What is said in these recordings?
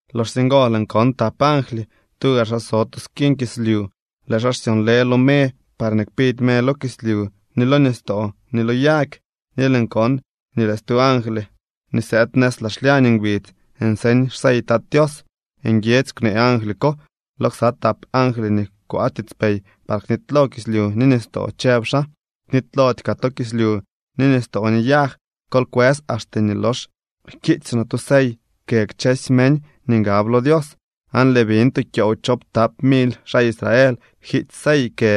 Loxsye ngo lëën kon tap angly, tuga xaa so tu skiñ kislyu. Lëë xaa xsyonlë lo me parñee kpidy me lo kislyu, ni lo nistoo, ni lo yag. Ni lëën kon nii lëë stu angly nii sëëd nëz laa xlyañ ngbidz nseñ xsey Tat Tios. Nguiedzy kwnee angly ko lo ksa tap angly nii kwaa tiitspey par knitylo kislyu ni nistoo, chëb xaa: —Knitylody kaa to kislyu ni nistoo ni yag. Kol kwës axte nii lox jkiitsy noo tu sey kë kchësy meñ nii ngab lo Dios. Aan lëën biñ tu kyoow choowptap mily xaa Israel jkiitsy sey kë.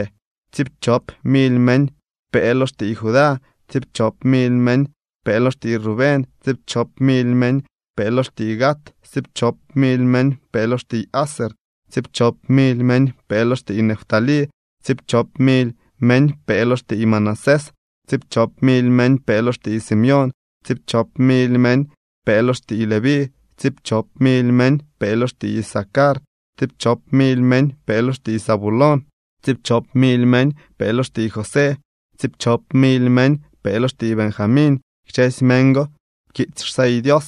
Tsiipchop mily meñ pee lo xtiiy Judá, tsiipchop mily meñ pee lo xtiiy Rubén, tsiipchop mily meñ pee lo xtiiy Gad, tsiipchop mily meñ pee lo xtiiy Aser, tsiipchop mily meñ pee lo xtiiy Neftalí, tsiipchop mily meñ pee lo xtiiy Manasés, tsiipchop mily meñ pee lo xtiiy Simeón, tsiipchop mily meñ pee lo xtiiy Leví, tsiipchop mily meñ pee lo xtiiy Isacar, tsiipchop mily meñ pee lo xtiiy Zabulón, tsiipchop mily meñ pee lo xtiiy José, tsiipchop mily meñ pee lo xtiiy Benjamín. Kchësy meñ go pkiitsy xsey Dios.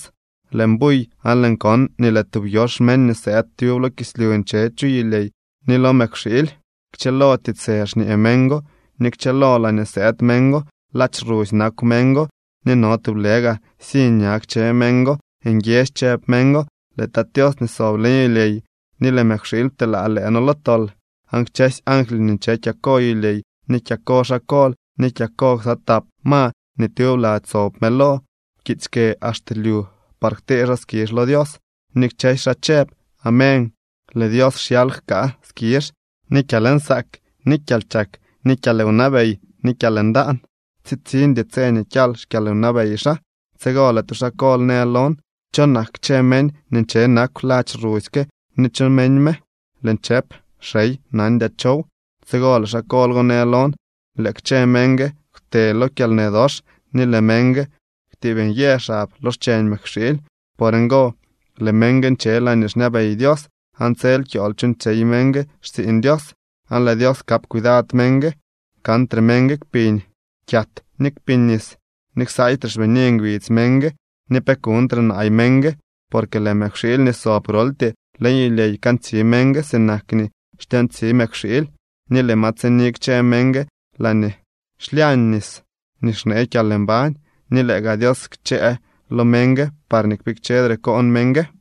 Lëën buy aan lëën kon nii lëë tub yox meñ nii sëëd tyub lo kislyu nche chu yulyey ni lo mëkwxiily. Kchëlo tiitsë xñee meñ go ni kchëlo laañee sëëd meñ go. Ladx rusy nakw meñ go ni no tublë gaa siñ ña kchë meñ go. Nguiedzy chëb meñ go: —Lëë Tat Tios nii sob leñ yulyey ni lëë mëkwxiily pteelaa lëë noo lo tol. Aan kchësy angly nii nche kyako yulyey ni kyako xaa kol ni kyako ksa tap ma nii tyub lady sob mëlo pkiitsy kë axte lyu par ktee xaa skizh lo Dios, ni kchësy xaa chëb: —¡Amén! Lëë Dios xyal jkaa skizh ni kyalnsaak ni kyalchak ni kyalwnabey ni kyalndaan. Tsitsiñdy tse nii kyal xkyalwnabey xaa. Tsigo lëë tu xaa kol në lon: —¿Cho nak kchë meñ nii nche nakw ladx rusy ke ni cho meñ me? Lëën chëp: —Xey, Nandyaa chow. Tsigo lëë xaa kol go në lon: —Lëë kchë meñ gue kwte lo kyalnë dox ni lëë meñ gue kwtiib nyë xab lo xcheñ mëkwxiily. Por ngo lëë meñ gue nche laañee xñabey Dios, aan tsel kyool chuuñtsyey meñ gue xtsiiñ Dios, aan lëë Dios kap cuidad meñ gue. Kantre meñ gue kpiñ kyat ni kpiñ nis, ni ksaaytre xbini ngbidz meñ gue ni pe kuñtre naay meñ gue, porque lëë mëkwxiily nii sob groltyee leñ yulyey kantsi meñ gue sinak nii xtyoontsi mëkwxiily, ni lëë ma tsini kchë meñ gue laañee xlyañ nis nii xnee kyalmbañ, ni lëë gaa Dios kchëë lo meñ gue parñee kpikchedre koon meñ gue.